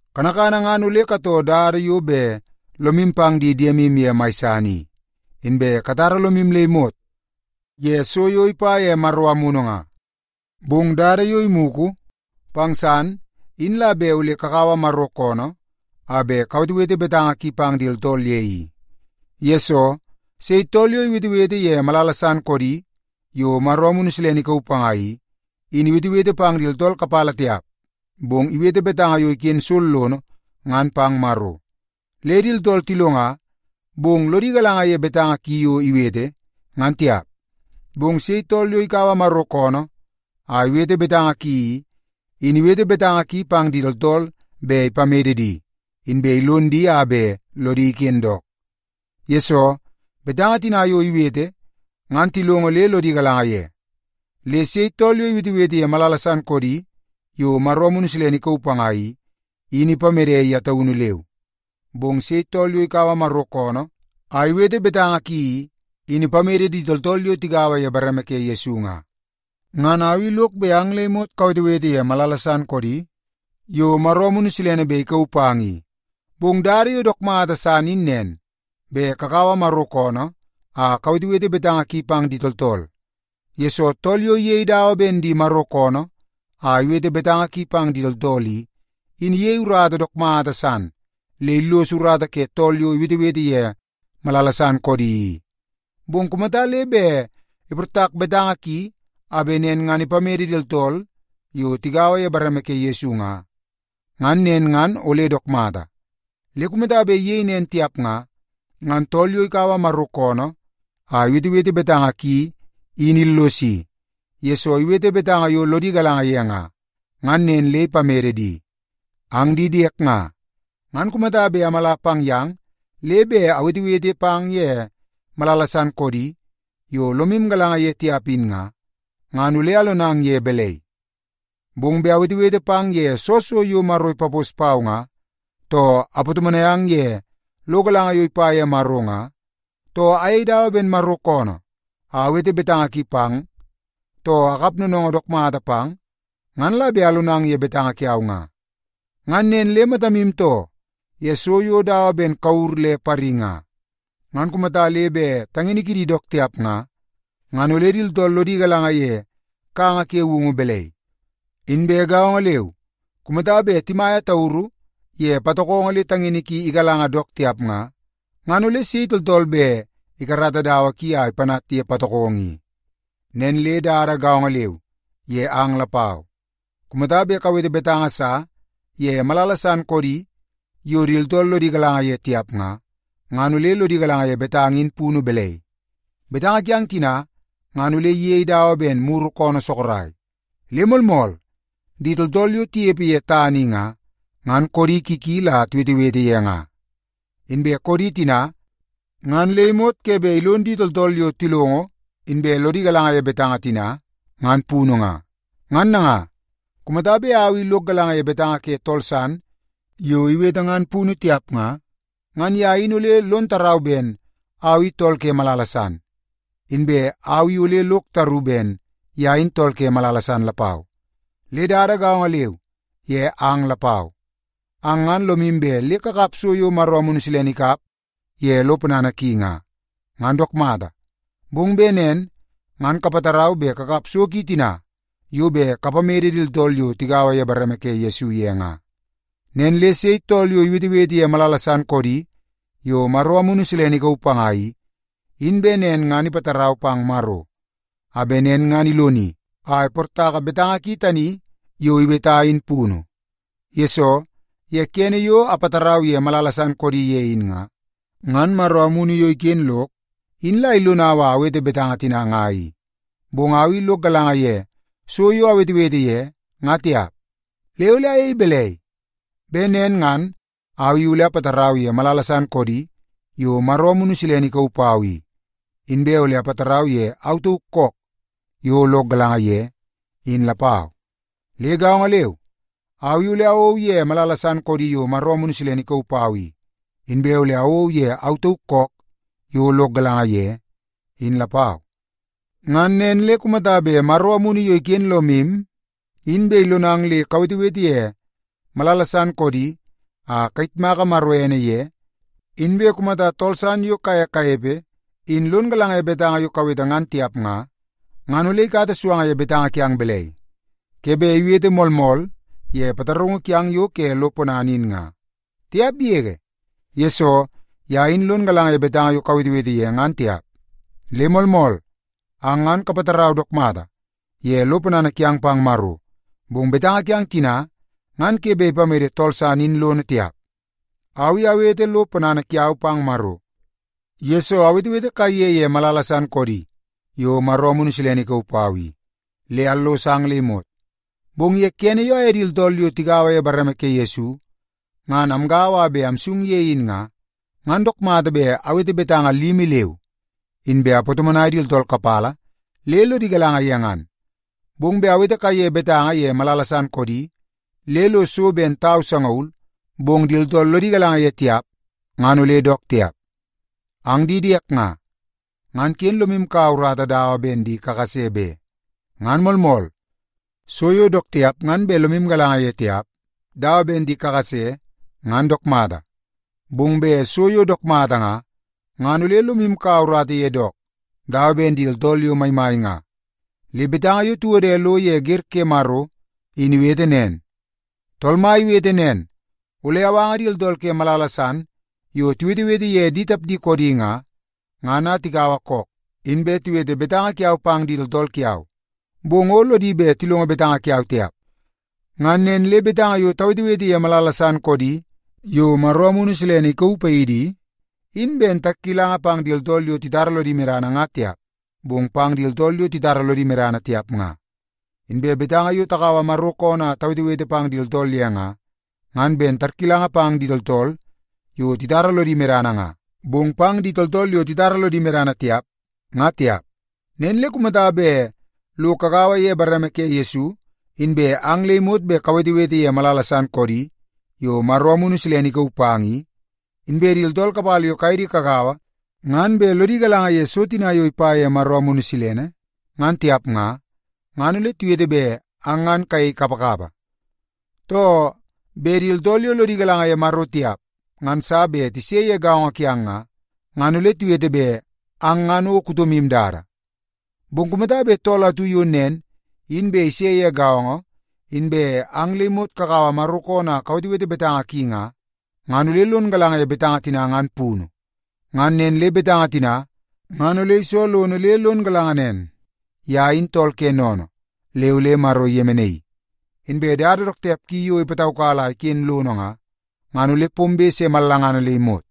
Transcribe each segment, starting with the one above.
Kanakana ngan ole katoo dada yo bet lomu pang di diemu ye mai san i, inbe katara lomu le imot ye so yo ipa ye Maro Amunu nga. Bong dada yo imugu pang san in la bet ole kakaua Maro koonoo a bet kawetewete betanga ki pang di tooltool ye i. Yesoo, sei tool yo iwetewete ye malala san koodi yo Maro Amunu Silene ikauu panga i, in iwetewete pang di tooltool kapala tiap, bong iwete betanga yo iken sollono ngan pang Maro. Le di tooltool tilonga, bong lodi galanga ye betanga ki yo iwete ngan tiap. Bong sei tool yo ikaua Maro koonoo a iwete betanga ki i, in iwete betanga ki pang di tooltool bet ipamede di, inbe ilon di a bet lodi iken dook. Yesoo, betanga tina yo iwete ngan tilongo le lodi galanga ye. Le sei tool yo iwetewete ye malala san koodi yo Maro Amunu Silene ikauu panga i, in ipamede ye taunu leu. Bong sei tool yo ikaua Maro koonoo a iwete betanga ki i, in ipamede di tooltool yo tigaua ye bareme ke Yesu nga. Ngan au i lok bet ang le imot kawetewete ye malala san koodi yo Maro Amunu Silene bet ikauu pang i. Bong dada yo dook mata san in nen, bet kakaua Maro koonoo a kawetewete betanga ki pang di tooltool, yesoo tool yo iyei dawa ben di Maro koonoo a iwete betanga ki pang di tooltool i, in iyei urata dook mata san le illos urata ke tool yo iwetewete ye malala san koodi i. Bong kumata le bet iportak betanga ki a bet nen ngan ipamede di tooltool yo tigaua ye bareme ke Yesu nga, ngan nen ngan ole dook mata. Le kumata bet iyei nen tiap nga, ngan tool yo ikaua Maro koonoo a iwetewete betanga ki in illosi, yesoo iwete betanga yo lodi galanga ye nga, ngan nen le ipamede di. Ang di diek nga, ngan kumata bet amala pang yang le bet awetewete pang ye malala san koodi yo lomu galanga ye tiap in nga, ngan ole alonang ye balai? Bong bet awetewete pang ye soo so yo Maro ipapos pau nga, too apatomonai ang ye lo galanga yo ipa ye Maro nga, too ayei dawa ben Maro koonoo a awete betanga ki pang, too akap noonoongoo dook mata pang, ngan la bet alonang ye betanga kiau nga. Ngan nen le matamu too ye so yo dawa ben kure le pari nga, ngan kumata le bet tangini kidi dook tiap nga, ngan ole di tooltool lodi galanga ye kanga ke woungu balai? Inbe gaongo leu, kumata bet timaia tauru ye patokongo le tangini ki igalanga dook tiap nga, ngan ole sei tooltool bet ikarata dawa ki a ipanat ye patokongo i? Nen le dada gaongo leu ye ang lapau. Kumata bet kawete betanga sa ye malala san koodi yo di tooltool lodi galanga ye tiap nga, ngan ole lodi galanga ye betanga in punu balai? Betanga kiang tina ngan ole iyei dawa ben muru koonoo sorok. Le moolmool, di tooltool yo tinepe ye tana i nga, ngan koodi ki ki la tiwetewete ye nga. Inbe koodi tina ngan le imot ke bet ilon di tooltool yo tilongo inbe lodi galanga ye betanga tina ngan punu nga. Ngan nanga, kumata bet au i lok galanga ye betanga ke tool san yo iwete ngan punu tiap nga, ngan ye in ole lon tarau ben au i tool ke malala san, inbe au i ole lok taru ben ye in tool ke malala san lapau. Le dada gaongo leu ye ang lapau. Ang ngan lomu bet le kakap so yo Maro Amunu Silene ikap ye lo ponana ki nga. Ngan dook mata, bong bet nen ngan kapatarau bet kakap so ki tina yo bet kapamede di tooltool yo tigaua ye bareme ke Yesu ye nga. Nen le sei tool yo iwetewete ye malala san koodi yo Maro Amunu Silene ikauu panga i, in bet nen ngan ipatarau pang Maro, a bet nen ngan iloni a iportaka betanga ki tani yo iweta in punu. Yesoo, ye kene yo apatarau ye malala san koodi ye in nga, ngan Maro Amunu yo iken lok in la ilonau a awete betanga tina nga i. Bong au i lok galanga ye so yo awetewete ye, nga tiap. Le ole ayei balai? Bet nen ngan au i ole apatarau ye malala san koodi yo Maro Amunu Silene ikauu pau i, inbe ole apatarau ye au tauk kook yo lok galanga ye, in lapau. Le gaongo leu, au i ole awou ye malala san koodi yo Maro Amunu Silene ikauu pau i, inbe ole awou ye au tauk kook yo lok galanga ye, in lapau. Ngan nen le kumata bet Maro Amunu yo iken lomu in bet ilonang le kawetewete ye malala san koodi a kayitmaka Maro ene ye, inbe kumata tool san yo kaye kanepe in lon galanga ye betanga yo kawete ngan tiap nga, ngan ole ikata suanga ye betanga kiang balai? Ke bet iwete “Moolmool” ye pataraungu kiang yo ke lo ponana in nga? Tiap yege, yesoo ye in lon galanga ye betanga yo kawetewete ye ngan tiap. Le moolmool, ang ngan kapatarau dook mata ye lo ponana kiang pang Maro, bong betanga kiang tina ngan ke bet ipamede tool san in lono tiap. Au i awete lo ponana kiau pang Maro, yesoo awetewete kaiye ye malala san koodi yo Maro Amunu Silene ikauu pau i, le allos ang le imot. Bong ye kene yo aye di tooltool yo tigaua ye bareme ke Yesu, ngan amgaua a bet amsung ye in nga, ngan dook mata bet awete betanga limi leu, inbe apatomonai di tooltool kapala le lodi galanga ye ngan. Bong bet awete kaiye betanga ye malala san koodi le lo so ben tau sangaul, bong bet di tooltool lodi galanga ye tiap nga, ngan ole dook tiap. Ang di diek nga, ngan ken lomu kaua urata dawa ben di kakase be. Ngan moolmool, so yo dook tiap ngan bet lomu galanga ye tiap dawa ben di kakase ngan dook mata. Bong bet so yo dook mata nga, ngan ole lomu kaua urata ye dook dawa ben di tooltool yo maimai nga. Le betanga yo tiwode lo ye wer ke Maro in iwete nen, “Tool Mai iwete nen, ‘Ole awanga di tooltool ke malala san yo tiwetewete ye di tapdi koodi nga, ngan a tikaua kook, inbe tiwete betanga kiau pang di tooltool kiau. Bong o lodi bet tilongo betanga kiau tiap.’” Ngan nen le betanga yo tawetewete ye malala san koodi yo Maro Amunu Silene ikauu paidi i, in ben tarkilanga pang di tooltool yo titara lodi medana nga tiap, bong pang di tooltool yo titara lodi medana tiap nga. Inbe betanga yo takaua Maro koonoo a tawetewete pang di tooltool ye nga, ngan ben tarkilanga pang di tooltool yo titara lodi medana nga, bong pang di tooltool yo titara lodi medana tiap, ngan tiap. Nen le kumata bet lo kagaua ye bareme ke Yesu, inbe ang le imot bet kawetewete ye malala san koodi yo Maro Amunu Silene ikauu pang i, inbe di tooltool kapala yo kaye di kagaua ngan bet lodi galanga ye so tina yo ipa ye Maro Amunu Silene ngan tiap nga, ngan ole tiwete bet ang ngan kayei kapakapa. Too, bet di tooltool yo lodi galanga ye Maro tiap ngan sa bet tise ye gaongo kiang nga, ngan ole tiwete bet ang ngan o kutomu dada. Bong kumata bet tool atu yo nen in bet ise ye gaongo, inbe ang le imot kakaua Maro koonoo a kawetewete betanga ki nga, ngan ole lon galanga ye betanga tina ngan punu. Ngan nen le betanga tina ngan ole iso lono le lon galanga nen, ye in tool ke sennene le ole Maro iyemenaii. Inbe dada dook tiap ki yo ipataukala a iken lono nga, ngan ole pombe se mallangana le imot.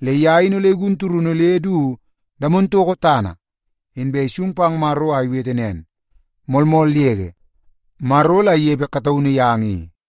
Le ye in ole igun turunu le du damono toko tana, inbe isung pang Maro a iwete nen, “Moolmool yege, Maro la inepe kataunu yang i.”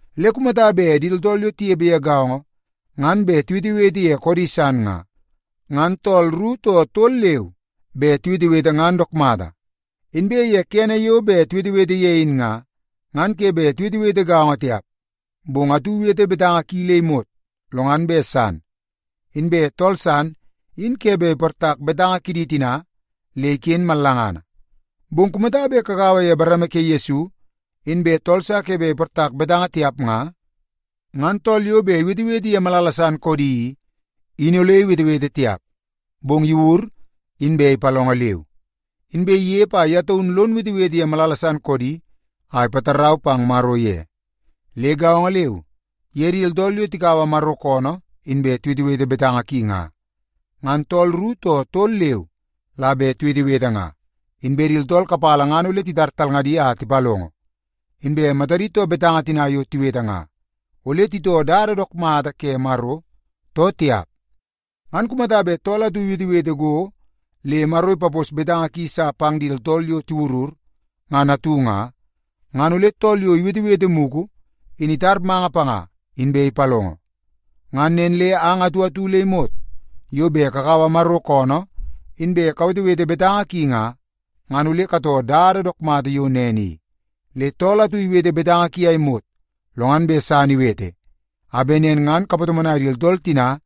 Le kumata bet di tooltool yo tinepe ye gaongo ngan bet tiwetewete ye koodi san nga, ngan tooltool ru too tol leu bet tiwetewete ngan dook mata. Inbe ye kene yo bet tiwetewete ye in nga, ngan ke bet tiwetewete gaongo tiap. Bong atu iwete betanga ki le imot, lo ngan bet san. Inbe tool san in ke bet iportak betanga kidi tina le iken mallangana. Bong kumata bet kagaua ye bareme ke Yesu, inbe tool sa ke bet iportak betanga tiap nga, ngan tool yo bet iwetewete ye malala san koodi i, in ole iwetewete tiap, bong iwur, inbe ipalongo leu. Inbe inepe a ye taunu lon wetewete ye malala san koodi a ipatarau pang Maro ye. Le gaongo leu ye di tooltool yo tikaua Maro koonoo inbe tiwetewete betanga ki nga. Ngan tooltool ru too tol leu la bet tiwetewete nga, inbe di tooltool kapala ngan ole titar talngadi a tipalongo, inbe matadi too betanga tina yo tiwete ngan, ole itoo dada dook mata ke Maro, too tiap. Ngan kumata bet tool atu iwetewete go le Maro ipapos betanga ki sa pang di tooltool yo tiwurur ngan atu nga, ngan ole tool yo iwetewete mugu in itar manga panga, inbe ipalongo. Ngan nen le ang atu atu le imot yo bet kakaua Maro koonoo inbe kawetewete betanga ki nga, ngan ole katoo dada dook mata yo nen i. Le tool atu iwete betanga ki a imot, lo ngan bet san iwete, a bet nen ngan kapatomonai di tooltool tina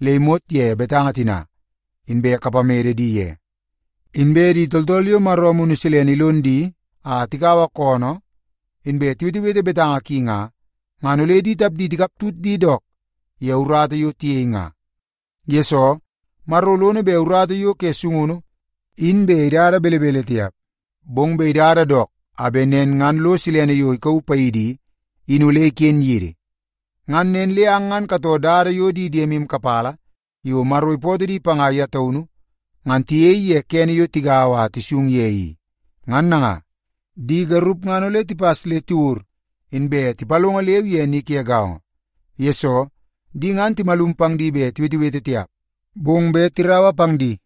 le imot ye betanga tina, inbe kapamede di ye. Inbe di tooltool yo Maro Amunu Silene ilon di a tikaua koonoo, inbe tiwetewete betanga ki nga, ngan ole di tapdi tikaptut di dook ye urata yo tiyei nga. Yesoo, Maro lono bet urata yo ke sungunu in bet idada belebele tiap, bong bet idada dook a bet nen ngan lo silene yo ikauu paidi i, in ole iken yidi. Ngan nen le ang ngan katoo dada yo di diemu kapala yo Maro ipootoo di panga ye taunu ngan tiyei ye kene yo tigaua a tisung ye i. Ngan nanga, di garup ngan ole tipas le tiwur, inbe tipalongo leu ye ni ke gaongo. Yesoo, di ngan timalum pang di bet tiwetewete tiap, bong bet tiraua pang di,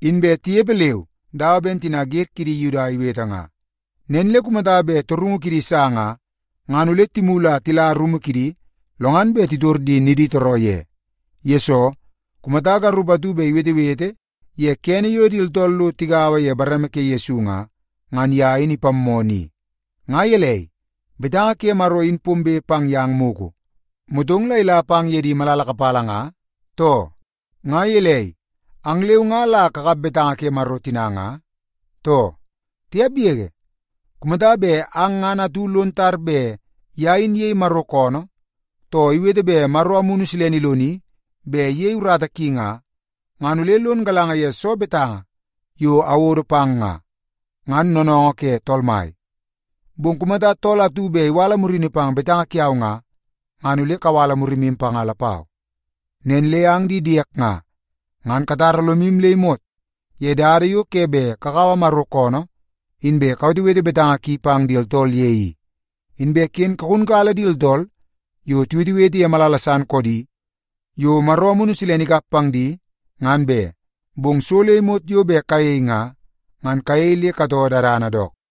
inbe tinepe leu dawa ben tina wer kidi Yuda iwete nga. Nen le kumata bet torungu kidi sa nga, ngan ole timulu a tila rumu kidi, lo ngan bet titor di niditooroo ye. Yesoo, kumata garup atu bet iwetewete ye kene yo di tooltool lo tigaua ye bareme ke Yesu nga, ngan ye in ipammoo ni. Nga gelei, betanga ke Maro in pombe pang yang mugu, motong la ila pang ye di malala kapala nga, too? Nga gelei, ang leu nga la kakap betanga ke Maro tina nga, too? Tiap yege! Kumata bet ang ngan atu lon tar bet ye in iyei Maro koonoo, too iwete bet Maro Amunu Silene iloni bet iyei urata ki nga, ngan ole lon galanga ye soo betanga yo awodo pang nga, ngan noonoongoo ke Tool Mai. Bong kumata tool atu bet iwala murini pang betanga kiau nga, ngan ole kawala murimu panga lapau. Nen le ang di diek nga, ngan katara lomu le imot ye dada yo ke bet kakaua Maro koonoo, inbe kawetewete betanga ki pang di tooltool ye i. Inbe ken kagunkala di tooltool yo tiwetewete ye malala san koodi yo Maro Amunu Silene ikap pang di ngan be. Bong so le imot yo bet kayei nga, ngan kayei le katoo dadana dook.